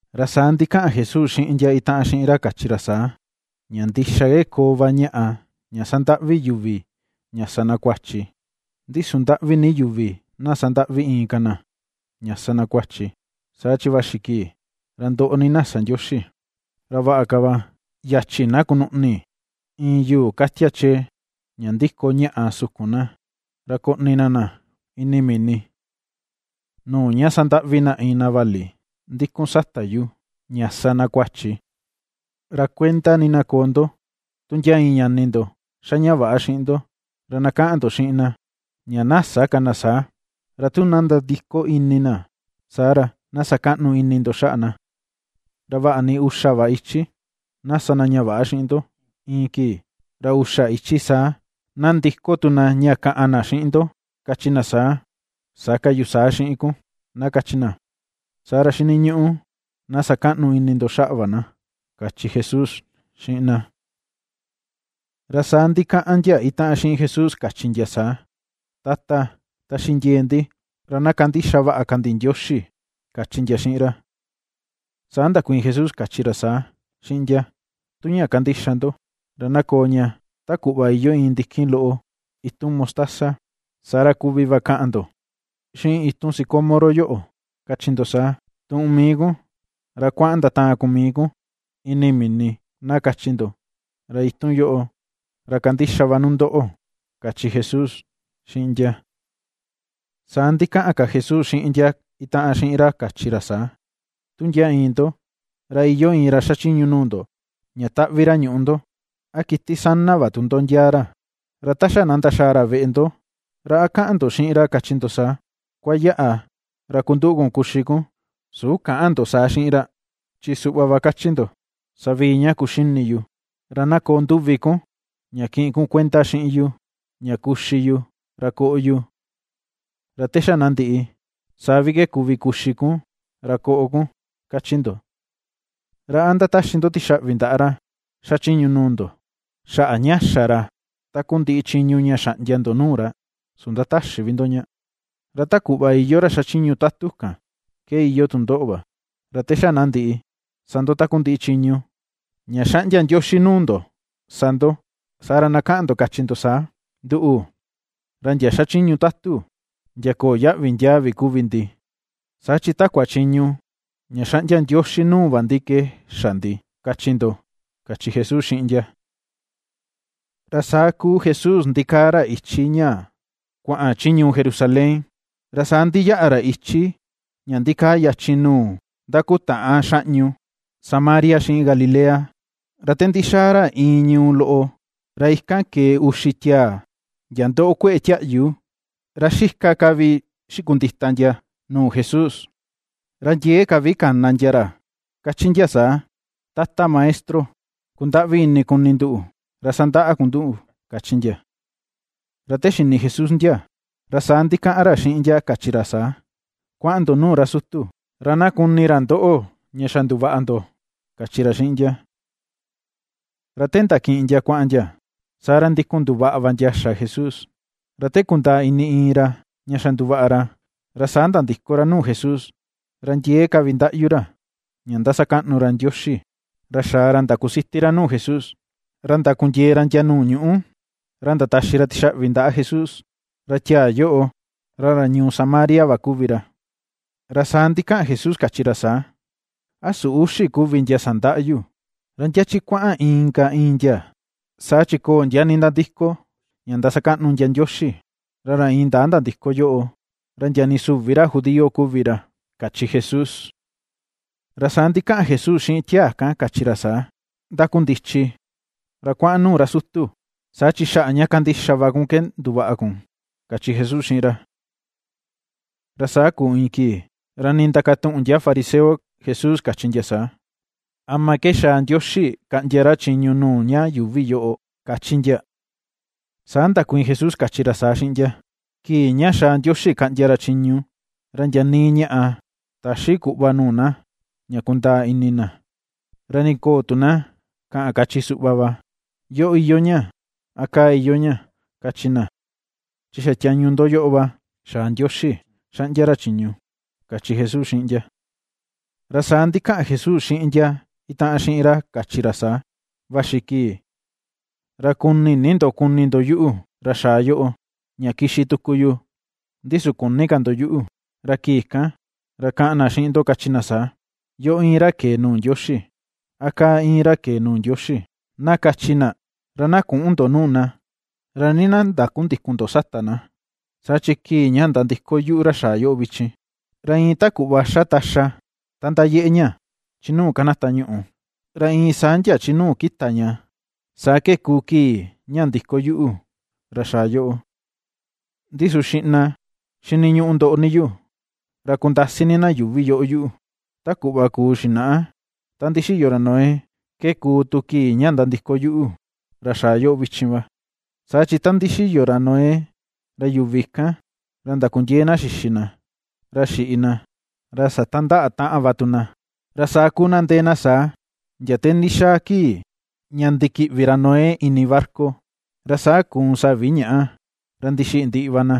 Ra saa ndikaꞌan Jesús xiꞌin ndia itaꞌan xiꞌin ra kachi ra saa: ―Ña ndixa ke koo va ñaꞌa ña sandaꞌvi yuvi ña sa na kuachi. ¡Ndi su ndaꞌvi ni yuvi na sandaꞌvi inka na ña sa na kuachi, saa chi vaxi kii ra ndoꞌo ni na sa Ndioxi! Ra vaꞌa ka va yachi na kunuꞌni iin yuu katia chee ña ndiko ñaꞌa sukun na, ra koꞌni na na ini mini, nuu ña sandaꞌvi na iin na vali ndikun sata yu, ña sa na kuachi. Ra kuenda ni na koo ndo. ’Tu ndia iin ñani ndo ^xa ña väꞌa xiꞌin ndo, ra na kaꞌan ndo xiꞌin na, ña na sä ka na saa. Ra tu na nandiko ini na, saa ra, na sa kaꞌnu ini ndo xaꞌa na. Ra vaꞌa ni uxa va ichi na sa na ña väꞌa xiꞌin ndo iin kii, ra uxa ichi saa na ndiko tu na ña kaꞌan na xiꞌin ndo kachi na saa: “Sä ka yu saa xiꞌin kun”, na kachi na, saa ra xiniñuꞌu na sa kaꞌnu ini ndo xaꞌa va na ―kachi Jesús xiꞌin na. Ra saa ndikaꞌan ndia itaꞌan xiꞌin Jesús kachi ndia saa: ―Tata, taxi ndie̱e̱ ndi ra na kandixa vaꞌa ka ndi Ndioxi ―kachi ndia xiꞌin ra. Saa ndakuiin Jesús kachi ra saa, xiꞌin ndia: ―Tu ña kandixa ndo ra na koo ña ta kuꞌva iyoo iin ndikin loꞌo itun mostaza, saa ra kuvi va kaꞌan ndo xiꞌin itun sicómoro yoꞌo kachi ndo saa: “Tuꞌun mii kun, ra kuaꞌan ndataan kun mii kun ini mini”, na kachi ndo, ra itun yoꞌo ra kandixa va nu ndoꞌo ―kachi Jesús xiꞌin ndia. Saa ndikaꞌan ka Jesús xiꞌin ndia itaꞌan xiꞌin ra kachi ra saa: ―Tu ndia iin ndo ra iyoo iin ra xachiñu nuu ndo, ña taꞌvi ra ñuꞌu ndo, a kiti sana va tu ndo ndiaa ra, ra ta xa na ndaxaa ra veꞌe ndo, ¿ra a kaꞌan ndo xiꞌin ra kachi ndo saa: “Kuayaꞌa ra kunduꞌu kun kuxi kun”? Su käꞌan ndo saa xiꞌin ra, chi suꞌva va kachi ndo: “Savii ña kuxini yu, ra na koo nduvi kun ña kiꞌin kun kuenda xiꞌin yu ña kuxi yu ra koꞌo yu. Ra te xa na ndiꞌi saa vi ke kuvi kuxi kun ra koꞌo kun”, ^kachi ndo. ¿Ra a ndataxi ndo tixaꞌvi ndaꞌa ra xachiñu nuu ndo xaꞌa ña xa ra takundiꞌi chiñu ña xaꞌndia ndo nuu ra? Su ndatäxi vi ndo ña. Ra ta kuꞌva iyoo ra xachiñu tatu kan ke iyoo tu ndoꞌo va, ra te xa na ndiꞌi sa ndo takundiꞌi chiñu ña xaꞌndia Ndioxi nuu ndo sa ndo; saa ra na kaꞌan ndo kachi ndo saa: “Nduꞌu ra ndia xachiñu tatu ndia köo yaꞌvi ndiaa vi kuvi ndi, saa chi takua chiñu ña xaꞌndia Ndioxi nuu va ndi ke xa ndi”, kachi ndo ―kachi Jesús xiꞌin ndia. Ra saa kuu Jesús ndikaa ra ichi ña kuaꞌan chi ñuu Jerusalén, ra saa ndiyaꞌa ra ichi ña ndikaa yachin nuu ndakutaꞌan xaꞌñu Samaria xiꞌin Galilea. Ra te ndixaa ra iin ñuu loꞌo, ra ikan ke̱e uxi tiaa ndia ndoꞌo kue̱ꞌe tiaꞌyu, ra xika ka vi xikundita ndia nuu Jesús. Ra ndiee ka vi kana ndia ra kachi ndia saa: ―¡Tata Maestro, kundaꞌvi ini kuni nduꞌu, ra sandaꞌa kun nduꞌu! ―kachi ndia. Ra te xini Jesús ndia, ra saa ndikaꞌan ra xiꞌin ndia kachi ra saa: ―Kuaꞌan ndo nuu ra sutu, ra na kuni ra ndoꞌo ña xa nduvaꞌa ndo ―kachi ra xiꞌin ndia. Ra te ndakiꞌin ndia kuaꞌan ndia, saa ra ndikun nduvaꞌa va ndia xa Jesús. Ra te kundaa ini iin ra ña xa nduvaꞌa ra, ra saa nandiko ra nuu Jesús ra ndiee ka vi ndaꞌyu ra ña ndasakaꞌnu Ndioxi. Ra xaa ra ndakusiti ra nuu Jesús, ra ndakundiee ra ndia nuu ñuꞌu, ra ndataxi ra tixaꞌvi ndaꞌa Jesús. Ra tiaa yoꞌo ra ra ñuu Samaria va kuvi ra. Ra saa ndikaꞌan Jesús, kachi ra saa: ―¿A su uxi kuvi ndia sandaꞌa yu? ¿Ra ndia chi kuaꞌan inka ìi̱n ndia? Saa chi köo ndia nindandiko ndasakaꞌnu ndia Ndioxi, ra ra indaa ndandiko yoꞌo ra ndia nii süvi ra judío kuvi ra ―kachi Jesús. Ra saa ndikaꞌan Jesús xiꞌin tiaa kan kachi ra saa: ―Ndakundichi ra kuaꞌan nuu ra sutu; saa chi xaꞌa ña kandixa va kun ke nduvaꞌa kun ―kachi Jesús xiꞌin ra. Ra saa kuu iin kii ra ndindakatuꞌun ndia fariseo Jesús kachi ndia saa: ―¿Ama ke xaa Ndioxi kaꞌndia ra chiñu nuu ña yuuvi yoꞌo? ―kachi ndia. Saa ndakuiin Jesús kachi ra saa xiꞌin ndia: ―Kii ña xaa Ndioxi kaꞌndia ra chiñu ra ndia nii ñaꞌa täxi kuꞌva nuu na ña kundaa ini na. Ra ni köo tu na kaꞌan kachi suꞌva va: “¡Yoꞌo iyoo ña!”, a “¡Kaa iyoo ña!”, kachi na. Chi xa tiañu ndo yoꞌo va xaa Ndioxi xaꞌndia ra chiñu ―kachi Jesús xiꞌin ndia. Ra saa ndikaꞌan Jesús xiꞌin ndia itaꞌan xiꞌin ra kachi ra saa: ―Vaxi kii, ra ku̱ni̱ ni ndo kuni ndo yuꞌu, ra xaa yoꞌo, ña kixi tuku yu, ndi su küni ka ndo yuꞌu. Ra kii kan ra kaꞌan na xiꞌin ndo kachi na saa, “Yoꞌo íin ra ke̱e nuu Ndioxi”; a “kaa íin ra ke̱e nuu Ndioxi”, na kachi na. Ra na küꞌun ndo nuu na, ra nii na ndakundïkun ndo sata na. Saa chi kii ña nandiko yuꞌu ra xaa yoꞌo vichin, ra iin ta kuꞌva xa taxa ta ndayeꞌe ña chi nuu kanata ñuꞌu ra iin saa ndia chi nuu kita ña, saa ke kuu kii ña ndiko yuꞌu, ra xaa yoꞌo. Ndi su xiꞌna xiniñuꞌu ndoꞌo ni yu ra kundasi ni na yuuvi yoꞌo yuꞌu. Ta kuꞌva kuu xinaꞌa ta ndixiyo ra Noé, ke kuu tu kii ña nandiko yuꞌu, ra xaa yoꞌo vichin va. Saa chi ta ndixiyo ra Noé, ra yuvi kan ra ndakundiee na xixi na, ra xiꞌi na, ra satandaꞌa taꞌan va tu na, ra saa kuu na ndee na saa, ndia te ndixaa kii ña ndikiꞌvi ra Noé ini barca. Ra saa kuun savi ñaꞌa ra ndixiꞌi ndiꞌi va na.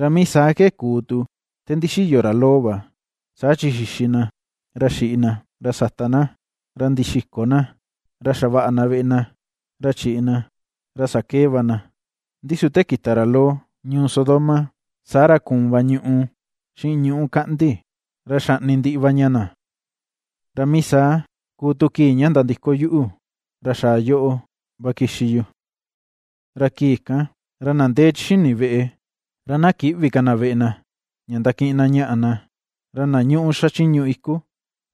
Ra mii saa ke kuu tu te ndixiyo ra Lot va: saa chi xixi na, ra xiꞌi na, ra sata na, ra ndixiko na, ra xavaꞌa na veꞌe na, ra chiꞌi na, ra sakee va na. Ndi su te kita ra Lot ñuu Sodoma, saa ra kuun va ñuꞌu xiꞌin ñuꞌu kaꞌndi, ra xaꞌni ndiꞌi va ña na. Ra mii saa kuu tu kii ña nandiko yuꞌu ra xaa yoꞌo va kixi yu. ’Ra kii kan, ra na ndee chi xini veꞌe, ra na kïꞌvi ka na veꞌe na, ña ndakiꞌin na ñaꞌa na; ra na ñuꞌu xachiñu iku,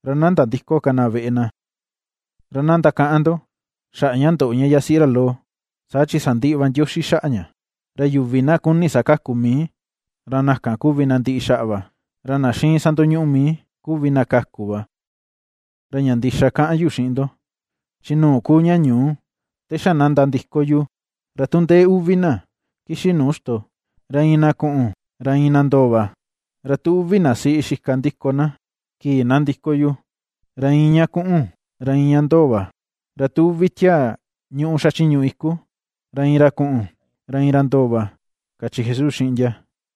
ra na nandïko ka na veꞌe na. Ra na ndakaꞌan ndo xaꞌa ña ndoꞌo ña yasiꞌi ra Lot, saa chi sandiꞌi va Ndioxi xaꞌa ña. Ra yuvi na kuni sakaku mii, ra na kan kuvi na ndiꞌi xaꞌa va; ra na xiin sandoñuꞌu mii, kuvi na kaku va. ’Ra ña ndixa kaꞌan yu xiꞌin ndo, chi nuu kuu ña ñuu te xa na nandiko yu, ra tu ndee uvi na kixi nuu ixto, ra iin na kuꞌun, ra iin na ndoo va. Ra tu uvi na siꞌi xika ndiko na, kii na ndiko yu, ra iin ña kuꞌun, ra iin ña ndoo va. Ra tu uvi tiaa ñuꞌu xachiñu iku, ra iin ra kuꞌun, ra iin ra ndoo va ―kachi Jesús xiꞌin ndia.